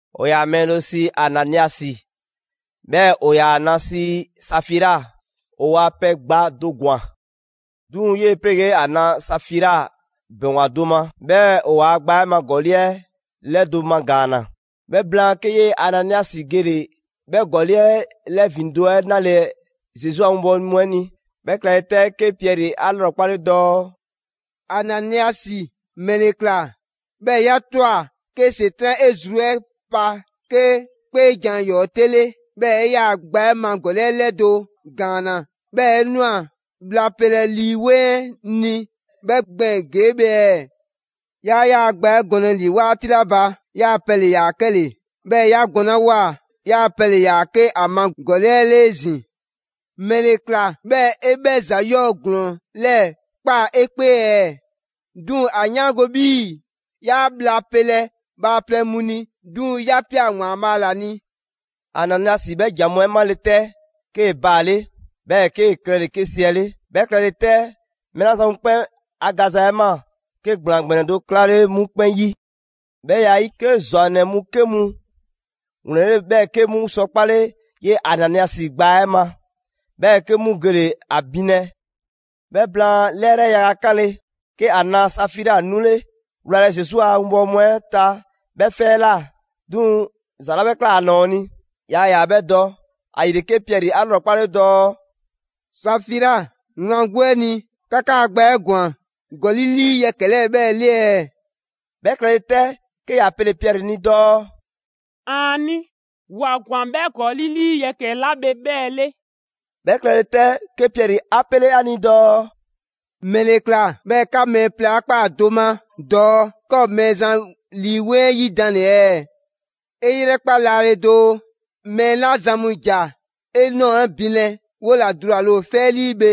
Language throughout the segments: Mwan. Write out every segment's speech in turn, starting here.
‑O ‑yaa mɛɛ do sii Ananiasi, 'bhɛɛ‑ ‑o ‑yaa ‑a na sii Safira. ‑O ‑waa pɛ gba do ‑gwan. 'Duŋ‑ 'yee‑ 'pegee ‑a na Safira ‑bɛŋgwa do ma, 'bhɛɛ‑ ‑o ‑waa' gba 'ɛ ma ‑gɔli' 'ɛ 'lɛdo‑ magaanna. 'Bhɛ blaan, 'ke 'yee‑ Ananiasi gele‑ 'bhɛ ‑gɔli' 'ɛ 'lɛ ‑vindo' 'ɛ 'nalɛ‑ Zesu a 'winbɔwo mu 'ɛ ni. 'Bhɛ klɛle 'tɛ, 'ke Piɛri 'a 'lrɔkpale dɔɔ: «Ananiasi, ‑mɛle ꞊kla 'bhɛɛ‑ 'ya ꞊twa 'ke ‑Setran' 'e zru 'ɛ pa 'ke 'kpeejan‑ ‑yɔɔ' 'te 'le, 'bhɛɛ‑ 'e 'yaa‑ gba 'ɛ ma ‑gɔli' 'ɛ 'lɛdo‑ ‑gaanna, 'bhɛɛ‑ 'e ꞊nwa bhla pelɛ Lii 'Weŋ 'ɛ ni 'bhɛ gbɛɛn‑ ‑gee' bhe ɛɛ? 'Yaa 'yaa‑ gba 'ɛ gɔnlɛ ‑li 'waati 'la ba, 'yaa‑ pɛ ‑le ‑yaa 'kɛle‑, 'bhɛɛ‑ 'ya gɔnlawoa 'yaa‑ pɛ ‑le ‑yaa 'ke ‑a ma gɔli' 'ɛ 'le 'ezin‑. ‑Mɛle ‑kla 'bhɛɛ‑ 'e 'bhɛ ‑za 'yɔɔ‑ ‑glɔɔn 'lɛɛ‑ ꞊kpaa 'e 'kpee ɛɛ? 'Duŋ‑ ‑a 'yaango‑ 'bhii‑ 'yaa bhla pelɛ bhaaplɛŋ mu ni, 'duŋ‑ 'ya ꞊pia ‑Waanbhaa' ‑la ni.» Ananiasi 'bhɛ ‑jan mu 'ɛ 'male‑ 'tɛ, 'kee‑ baale', 'bhɛɛ‑ 'kee‑ klɛle‑ 'ke 'siɛle. 'Bhɛ klɛle 'tɛ, mɛɛ 'la zan mu 'kpɛn 'a gaza 'ɛ ꞊maa, 'ke ‑gblaan ‑gbɛnɛ do 'klale 'mu 'kpɛn 'yi. 'Bhɛ ya 'ɛ 'yi, 'ke ‑zwannɛ mu 'ke mu ‑wlɛnle', 'bhɛɛ‑ 'ke 'mu sɔ 'kpale 'yee‑ Ananiasi gbaa 'ɛ ma, 'bhɛɛ‑ 'ke 'mu gele‑ ‑a binlɛ. 'Bhɛ blaan 'lɛrɛ yaga 'kanle‑, 'ke ‑a na Safira 'nule‑ wlalɛ Zesu a 'winbɔwo mu 'ɛ ta 'bhɛ 'fɛ 'ɛ ꞊la; 'duŋ‑ ‑za 'la 'bhɛ ꞊kla ‑a ‑nɔɔ ni yaa ‑yaa 'bhɛ dɔ. ‑Ayile, 'ke Piɛri 'a 'lrɔkpale dɔɔ: «Safira, wlan 'gbu 'ɛ a ni, 'ka 'kaa‑ gba 'ɛ ‑gwan ‑gɔli' 'lii yɛkɛ‑ 'lɛɛ‑ 'bhɛɛ‑ 'le ɛɛ?» 'Bhɛ klɛle 'tɛ, 'ke ‑ya pele‑ Piɛri ni dɔɔ: «‑Aani', 'wa ‑gwan 'bhɛ ‑gɔli' 'lii yɛkɛ‑ 'la bhe 'bhɛɛ‑ 'le.» 'Bhɛ klɛle 'tɛ, 'ke Piɛri 'a 'pele ‑a ni dɔɔ: «‑Mɛle ꞊kla 'bhɛɛ‑ 'ka mɛɛ plɛ 'a ꞊kpaa do ma dɔɔ 'ka ‑o Mɛɛzan Lii 'Weŋ 'ɛ 'yidanle ɛɛ? 'E 'yrɛkpa laale doo, mɛɛ 'la zan mu ‑ja 'e ꞊nɔɔ 'ɛ binlɛ 'wo ‑la dulale ‑o 'fɛ 'ɛ 'lii bhe.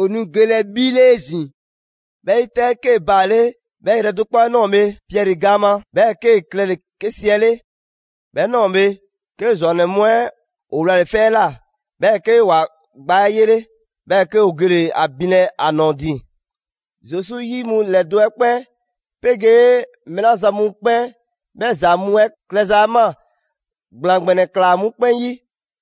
‑O nu gelɛ 'bhi 'le 'ezin‑.» 'Bhɛ 'yi 'tɛ, 'kee‑ baale' 'bhɛ 'yrɛ do 'kpɔ 'ɛ ꞊nɔɔ bhe Piɛri gaan ma, 'bhɛɛ‑ 'kee‑ klɛle‑ 'ke siɛle'. 'Bhɛ ꞊nɔɔ bhe, 'ke ‑zwannɛ mu 'ɛ ‑o wlale‑ 'fɛ 'ɛ ꞊la, 'bhɛɛ‑ 'ke ‑wa gbaa 'ɛ 'yele; 'bhɛɛ‑ 'ke ‑o gele‑ ‑a binlɛ ‑a ‑nɔɔ ‑din. Zesu 'yi mu ‑lɛdo' 'ɛ 'kpɛn 'pegee mɛɛ 'la zan mu 'kpɛn 'bhɛ ‑za mu 'ɛ klɛza ‑maa, ‑gblaan ‑gbɛnɛ ꞊klaa 'mu 'kpɛn 'yi.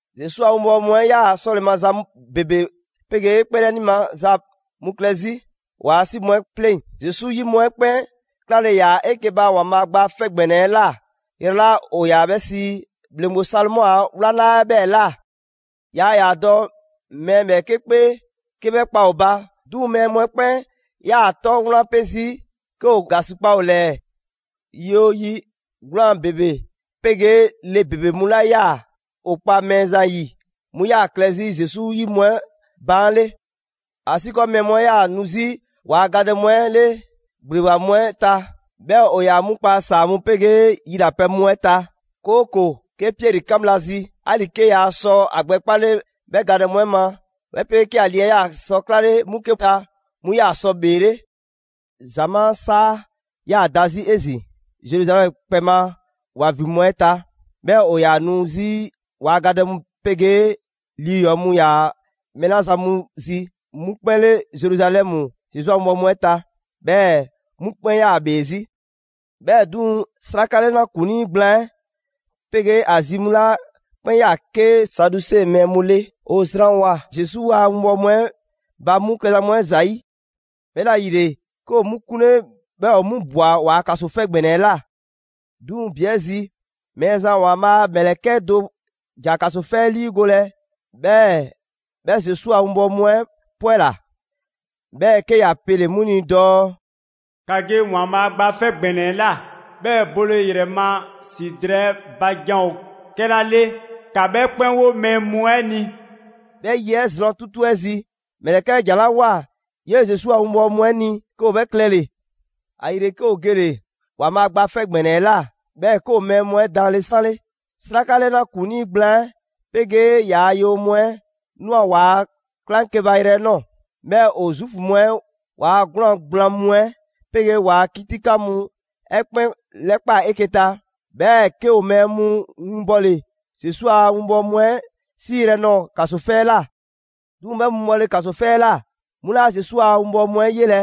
Zesu a 'winbɔwo mu 'ɛ ‑yaa 'sɔle maza ‑bebe 'pegee 'kpeelɛni maza mu klɛ 'zi ‑waa' 'si mu 'ɛ 'pleŋ. Zesu 'yi mu 'ɛ 'kpɛn 'klale‑ ‑yaa 'eke‑ ba ‑Waanbhaa' Gba 'Fɛ ‑Gbɛnɛ 'ɛ ꞊la yrɛ 'la ‑o ‑yaa 'bhɛ sii: ‹‑Bhleŋgbe Salomɔ a 'wlaŋla› 'ɛ 'bhɛɛ‑ ꞊la. Yaa ‑yaa dɔ mɛɛ ‑bhɛɛke' 'kpee 'ke 'bhɛ kpa ‑o ba, 'duŋ‑ mɛɛ mu 'ɛ 'kpɛn 'yaa‑ ‑o 'tɔ wlan pe 'zi 'ke ‑o ‑gasikpa ‑o ‑lɛɛ. Yi 'oo yi, 'gwlaan‑ ‑bebe 'pegee le ‑bebe mu 'la 'yaa‑ ‑o 'kpa Mɛɛzan 'yi, 'mu 'yaa‑ klɛ 'zi Zesu 'yi mu 'ɛ baan' 'le. ‑Asiikɔɔ mɛɛ mu 'ɛ 'yaa‑ nu 'zi ‑waa' gadɛ mu 'ɛ 'le ‑gbleba mu 'ɛ ta, 'bhɛɛ‑ ‑o ‑yaa 'mu kpa ‑saa mu 'pegee yilapɛ mu 'ɛ ta. 'Kooko‑ 'ke Piɛri 'kan bhla zi, 'ali‑ 'kee‑ ‑yaa sɔ ‑a gbɛ 'kpale 'bhɛ gadɛ mu 'ɛ ma, 'bhɛ 'pegee 'ke ‑a lii 'ɛ 'yaa‑ sɔ 'klale 'mu 'ke ta, 'mu 'yaa sɔ ‑bheele'. ‑Zamaa' 'saa 'yaa‑ da 'zi 'ezin‑ Zeruzalɛmu kpɛ ma ‑wa ‑vin mu 'ɛ ta, 'Bhɛɛ‑ ‑o ‑yaa nu 'zi ‑waa' gadɛ mu 'pegee lii ‑yɔɔ mu ‑yaa mɛɛ 'la zan mu zi 'mu 'kpɛn 'le Zeruzalɛmu Zesu a 'winbɔwo mu 'ɛ ta, 'bhɛɛ‑ 'mu 'kpɛn 'yaa‑ ‑bhee 'zi. 'Bhɛɛ‑ 'duŋ‑, 'sraka 'lɛna ‑kuŋlii gblaan 'ɛ 'pegee ‑a zi mu 'la 'kpɛn 'yaa‑ 'ke Saduse mɛɛ mu 'le, ‑o zranwoa‑ Zesu a 'winbɔwo mu 'ɛ ba 'mu klɛza mu 'ɛ ‑zayi'. 'Bhɛla‑ ‑yile, 'ke ‑o 'mu 'kunle, 'bhɛɛ‑ ‑o 'mu ꞊bwa ‑waa' ‑kaso 'fɛ ‑gbɛnɛ 'ɛ ꞊la. 'Duŋ‑ ‑bi 'ɛ zi, Mɛɛzan ‑Waanbhaa' a ‑mlɛkɛ' 'ɛ do ‑ja ‑kaso 'fɛ 'ɛ 'liigolɛ, 'bhɛɛ‑ 'bhɛ Zesu a 'winbɔwo mu 'ɛ 'pwɛla‑. 'Bhɛɛ‑ 'ke ‑ya pele‑ 'mu ni dɔɔ: «‑Ka ge ‑Waanbhaa' Gba 'Fɛ ‑Gbɛnɛ 'ɛ ꞊la, 'bhɛɛ‑ bole ‑yrɛ ma ‑si drɛɛ 'ɛ ba jan ‑o 'kɛla 'le, ‑ka 'bhɛ 'kpɛn 'wo mɛɛ mu 'ɛ ni.» 'Bhɛ 'yi 'ɛ zrwan 'tutu 'ɛ zi, ‑mlɛkɛ' 'ɛ ‑jan 'la ꞊woa 'yee‑ Zesu a 'winbɔwo mu 'ɛ ni, 'ke ‑o 'bhɛ klɛle‑. ‑Ayile 'ke ‑o gele‑ ‑Waanbhaa' Gba 'Fɛ ‑Gbɛnɛ 'ɛ ꞊la, 'bhɛɛ‑ 'ke ‑o mɛɛ mu 'ɛ daanle 'sanle. 'Sraka 'lɛna ‑kuŋlii gblaan 'ɛ 'pegee ‑yaa' yewoyɔɔn mu 'ɛ ꞊nwa ‑waa' 'klaŋkeba yrɛ 'ɛ ꞊nɔɔ; 'bhɛɛ‑ ‑o Zuufu mu 'ɛ ‑waa' 'gwlaan‑ gblaan mu 'ɛ 'pegee ‑waa' 'kitikan mu 'ɛ 'kpɛn 'lɛkpaa‑ 'eke‑ ta. 'Bhɛɛ‑ 'ke ‑o mɛɛ mu winbɔle Zesu a 'winbɔwo mu 'ɛ 'siiyrɛ‑ nɔɔ‑ ‑kaso 'fɛ 'ɛ ꞊la. 'Duŋ‑ 'bhɛ mu bhɔle ‑kaso 'fɛ 'ɛ ꞊la, 'mu 'laa Zesu a 'winbɔwo mu 'ɛ 'yelɛ‑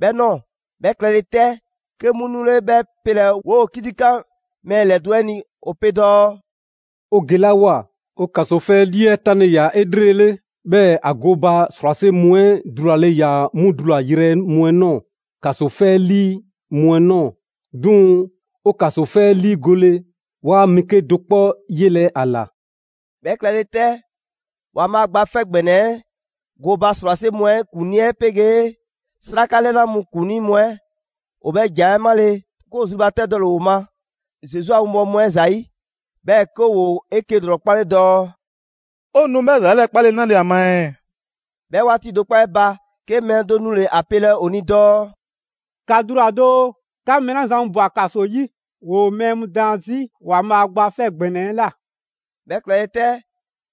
'bhɛ ꞊nɔɔ. 'Bhɛ klɛle 'tɛ, 'ke 'mu nule‑ 'bhɛ 'pelɛ‑ 'woo‑ 'kitikan mɛɛ ‑lɛdo' 'ɛ ni. ‑O pe dɔɔ: «'O gelawoa, 'o ‑kaso 'fɛ 'lii 'ɛ 'tanle‑ ꞊ya 'elrele, 'bhɛɛ‑ ‑a gooba ‑srwase' mu 'ɛ dulale ‑yaa 'mu dulayrɛ mu 'ɛ ꞊nɔɔ ‑kaso 'fɛ 'ɛ 'lii mu 'ɛ ꞊nɔɔ. 'Duŋ‑ 'o ‑kaso 'fɛ 'ɛ 'liigole, 'waa mɛɛ 'kedo‑ 'kpɔ yelɛ ‑a ꞊la.» 'Bhɛ klɛle 'tɛ, ‑Waanbhaa' Gba 'Fɛ ‑Gbɛnɛ 'ɛ gooba ‑srwase' mu 'ɛ ‑kuŋlii 'ɛ 'pegee 'sraka 'lɛna mu ‑kuŋlii mu 'ɛ, ‑o 'bhɛ ‑jan 'ɛ 'male‑, 'ke ‑o zrubatɛdɔle ‑o ma Zesu a 'winbɔwo mu 'ɛ ‑zayi'; 'bhɛɛ‑ 'ke ‑woo 'eke‑ ‑lrɔkpale dɔɔ: «'O nu 'bhɛ ‑za 'lɛɛ‑ 'kpalɛ‑ 'nale‑ ‑a ma ɛɛ?» 'Bhɛ 'waati do 'kpɔ 'ɛ ba, 'ke mɛɛ do nule‑ ‑a pelɛ ‑o ni dɔɔ: «‑Ka dula‑ doo! 'Ka mɛɛ 'la zan mu ꞊bwa ‑kaso 'yi, ‑woo mɛɛ mu daan 'zi ‑Waanbhaa' Gba 'Fɛ ‑Gbɛnɛ 'ɛ ꞊la.» 'Bhɛ klɛle 'tɛ,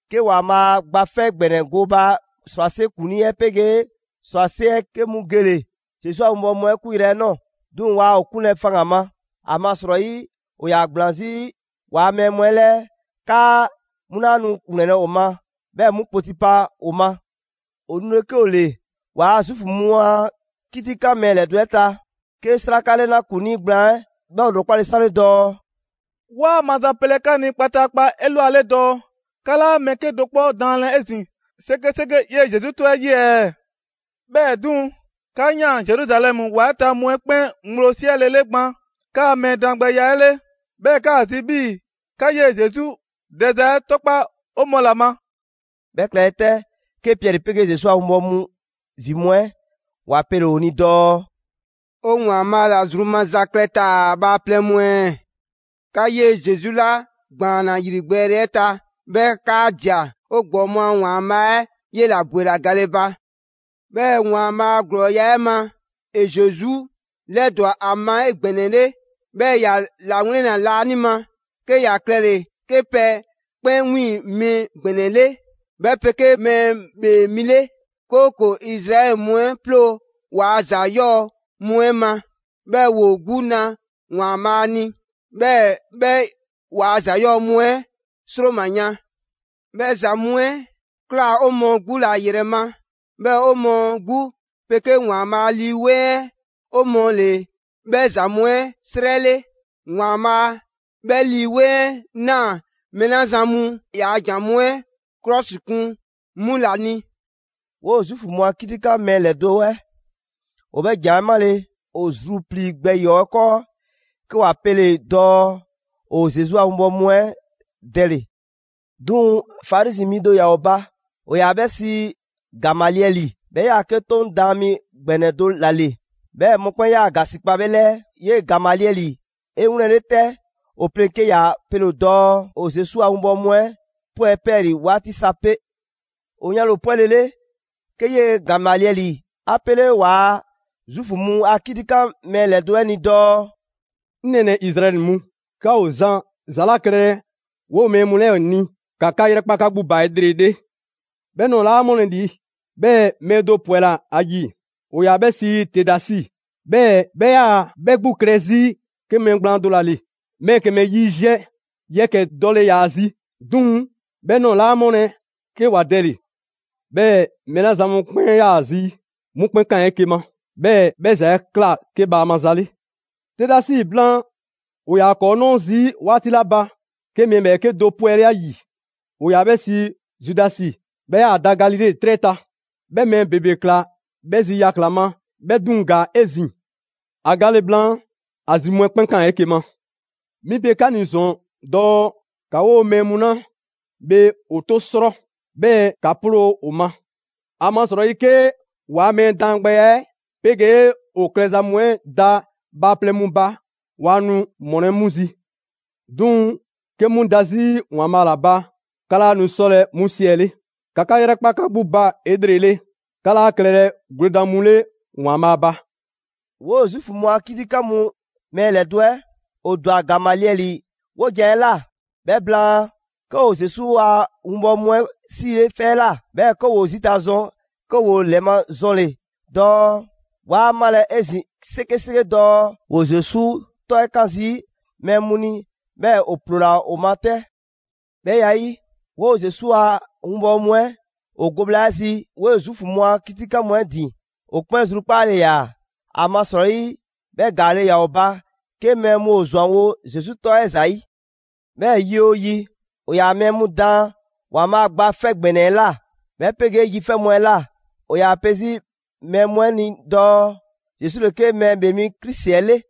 'ke ‑Waanbhaa' Gba 'Fɛ ‑Gbɛnɛ 'ɛ gooba ‑srwase' ‑kuŋlii 'ɛ 'pegee ‑srwase' 'ɛ 'ke mu gele‑ Zesu a 'winbɔwo mu 'ɛ 'kunyrɛ‑ nɔɔ‑. 'Duŋ‑ waa ‑o 'kunlɛ‑ faŋgan‑ ma, ‑amasrɔyi ‑o ‑yaa ‑gblaan 'zi ‑waa' mɛɛ mu 'ɛ 'lɛɛ 'kaa 'mu 'laa nu ‑wlɛnlɛ' ‑o ma 'bhɛɛ‑ 'mu kpoti pa ‑o ma. ‑O nule 'ke ‑o ‑le ‑waa' Zuufu mu a 'kitikan mɛɛ ‑lɛdo' 'ɛ ta, 'ke 'sraka 'lɛna ‑kuŋlii gblaan 'ɛ 'bhɛ ‑o ‑lrɔkpale 'sanle dɔɔ: «'Waa mazapɛlɛ 'ka ni kpataakpa 'elwale dɔɔ 'ka 'laa mɛɛ 'kedo‑ 'kpɔ daanlɛ 'ezin‑ 'sekeseke 'yee‑ Zesu 'tɔ 'ɛ 'yi ɛɛ? 'Bhɛɛ‑ 'duŋ‑, 'ka 'yaan‑ Zeruzalɛmu ‑wa 'ɛ ta mu 'ɛ 'kpɛn ŋgblo 'siɛlele gban 'kaa‑ mɛɛ daangbɛya 'ɛ 'le, 'bhɛɛ‑ 'kaa‑ zi 'bhii‑ 'ka 'yee‑ Zesu dɛza 'ɛ 'tɔkpa‑ 'o mɔɔ ‑la ma.» 'Bhɛ klɛle 'tɛ, 'ke Piɛri 'pegee Zesu a 'winbɔwo mu ‑vin mu 'ɛ ‑wa pele‑ ‑o ni dɔɔ: «'O ‑Waanbhaa' ‑la zru maza klɛ taa‑ bhaaplɛŋ mu ɛɛ? 'Ka 'yee‑ Zesu 'la ‑gbaanna ‑yrigbɛɛle 'ɛ ta, 'bhɛɛ‑ 'kaa ꞊dia, 'o ‑gbɔɔ mu a ‑Waanbhaa' 'ɛ 'yela‑ ‑bwela gale ba. 'Bhɛɛ‑ ‑Waanbhaa' a ‑glɔɔya' 'ɛ ma, ‑e Zesu 'lɛdwa‑ ‑a ma 'egbɛnɛle. 'Bhɛɛ‑ ‑ya ‑lawlɛnna laanima, 'ke ‑ya klɛle‑ 'ke pɛ 'kpɛn 'wiiŋ‑ mi ‑gbɛnɛ 'le, 'bhɛ 'pegee Mɛɛ ‑Bhee Mi 'le, 'kooko‑ Izraɛli mu 'ɛ ploo waa ‑za 'yɔɔ‑ mu 'ɛ ma, 'bhɛɛ‑ ‑woo 'gbu na ‑Waanbhaa' ni; 'bhɛɛ‑ 'bhɛ ‑waa' ‑za 'yɔɔ‑ mu 'ɛ ‑sroma yan. 'Bhɛ ‑za mu 'ɛ ꞊kla 'o mɔɔ 'gbu ‑la 'yrɛ ma, 'bhɛɛ‑ 'o mɔɔ 'gbu 'pegee ‑Waanbhaa' Lii 'Weŋ 'ɛ 'o mɔɔ ‑le 'bhɛ ‑za mu 'ɛ 'srɛ 'le; ‑Waanbhaa' 'bhɛ Lii 'Weŋ 'ɛ ꞊naa mɛɛ 'la zan mu ‑yaa' jan mu 'ɛ 'klɔsikun 'mu ‑la ni.» 'Woo‑ Zuufu mu a 'kitikan mɛɛ ‑lɛdo' 'ɛ ‑o 'bhɛ ‑jan 'ɛ 'male, ‑o zruplii‑ gbɛ ‑yɔɔ' 'ɛ 'kɔɔ, 'ke ‑wa pele‑ dɔɔ ‑o Zesu a winbɔwo mu 'ɛ dɛle‑. 'Duŋ‑ Farizi mi do ‑yaa ‑o ba, ‑o ‑yaa 'bhɛ sii Gamaliɛli. 'Bhɛ 'yaa‑ 'ke 'Toŋ daan mi ‑gbɛnɛ do ‑la ‑le, 'bhɛɛ‑ mɔkpɛn' 'yaa‑ ‑gasikpa 'bhɛ 'lɛɛ. 'Yee‑ Gamaliɛli 'e 'wlɛnle‑ 'tɛ ‑o pleŋ‑ 'ke ‑ya pele‑ dɔɔ ‑o Zesu a 'winbɔwo mu 'ɛ 'pwɛ 'pɛɛlii‑ 'waati sa 'pe. ‑O yanle ‑o 'pwɛlele, 'ke 'yee‑ Gamaliɛli 'a 'pele ‑waa' Zuufu mu a 'kitikan mɛɛ ‑lɛdo' 'ɛ ni dɔɔ: «'Ŋ nɛɛnɛ‑ Izraɛli mu, 'ka ‑o zan ‑za 'la klɛlɛ 'woo‑ mɛɛ mu 'lɛɛ‑ ni, ‑ka 'ka 'yrɛkpa 'ka 'gbu ba 'elrele. 'Bhɛ ꞊nɔɔ 'laa ‑mɔlɛ' ‑li, 'bhɛɛ‑ mɛɛ do ‑pwɛla ‑a ‑yi, ‑o ‑yaa 'bhɛ sii Tedasi, 'bhɛɛ‑ 'bhɛ 'yaa‑ 'bhɛ 'gbu klɛ 'zi 'ke mɛɛ gblaan do ‑la ‑le. Mɛɛ ‑kɛmɛ yiziɛ yɛkɛ‑ dɔle ‑yaa zi. 'Duŋ‑, 'bhɛ ꞊nɔɔ 'laa ‑mɔlɛ' 'ke ‑wa dɛle‑. 'Bhɛɛ‑ mɛɛ 'la zan mu 'kpɛn 'yaa‑ zi, 'mu 'kpɛn 'kaan‑ 'eke‑ ma; 'bhɛɛ‑ 'bhɛ ‑za 'ɛ ꞊kla 'ke bhaama ‑za 'le. Tedasi blaan, ‑o ‑yaa ‑kɔɔ' 'nɔɔ zii' 'waati 'la ba, 'ke mɛɛ ‑bhɛɛke' do 'pwɛle ‑a ‑yi: ‑o ‑yaa 'bhɛ sii Zudasi, 'bhɛ ‑yaa da Galile 'trɛ ta. 'Bhɛ mɛɛ ‑bebe ꞊klaa 'bhɛ zi yakla‑ ma; 'bhɛ 'duŋ‑ ‑gaa 'ezin‑. ‑A gale blaan, ‑a zi mu 'ɛ 'kpɛn 'kaan‑ 'eke‑ ma. 'Mi pe 'ka ni ‑zɔn dɔɔ ‑ka 'woo‑ mɛɛ mu 'la bhe ‑o 'to 'srɔ, 'bhɛɛ‑ ‑ka 'ploo ‑o ma. ‑Amasrɔyi 'ke ‑waa' mɛɛ daangbɛya 'ɛ 'pegee ‑o klɛza mu 'ɛ da bhaaplɛŋ mu ba, waa nu ‑mɔlɛ' 'mu zi. 'Duŋ‑ 'ke 'mu da 'zi ‑Waanbhaa' ‑la ba, 'ka 'laa nu 'sɔlɛ‑ 'mu 'siɛle. ‑Ka 'ka 'yrɛkpa 'ka 'gbu ba 'elrele, 'ka 'laa klɛlɛ gwledan mu 'le ‑Waanbhaa' ba!» 'Woo Zuufu mu a 'kitikan mu mɛɛ ‑lɛdo' 'ɛ, ‑o ‑dwa Gamaliɛli 'wojan‑ 'ɛ ꞊la. 'Bhɛ blaan, 'ke ‑o Zesu a 'winbɔwo mu 'ɛ 'siile 'fɛ 'ɛ ꞊la. 'Bhɛɛ‑ ‑woo zita ꞊zwan, 'ke ‑woo ‑lɛmazɔnle‑ dɔɔ waa malɛ 'ezin‑ 'sekeseke dɔɔ ‑woo Zesu 'tɔ 'ɛ 'kan zii' mɛɛ mu ni; 'bhɛɛ‑ ‑o ‑ploola ‑o ma 'tɛ. 'Bhɛ ya 'ɛ 'yi, 'woo‑ Zesu a 'winbɔwo mu 'ɛ ‑o go bhla 'ɛ zi 'woo‑ Zuufu mu a 'kitikan mu 'ɛ ‑din, ‑o 'kpɛn zrukpaale ‑yaa. ‑Amasrɔyi 'bhɛ ‑gaale' ‑yaa ‑o ba 'ke mɛɛ mu ‑o ‑zwanwo' Zesu 'tɔ 'ɛ ‑zayi'. 'Bhɛɛ‑ yi 'oo yi, ‑o ‑yaa mɛɛ mu daan ‑Waanbhaa' Gba 'Fɛ ‑Gbɛnɛ 'ɛ ꞊la, 'bhɛ 'pegee yi 'fɛ mu 'ɛ ꞊la. ‑O ‑yaa pe 'zi mɛɛ mu 'ɛ ni dɔɔ Zesu ‑le 'ke Mɛɛ ‑Bhee Mi Krisi 'ɛ 'le.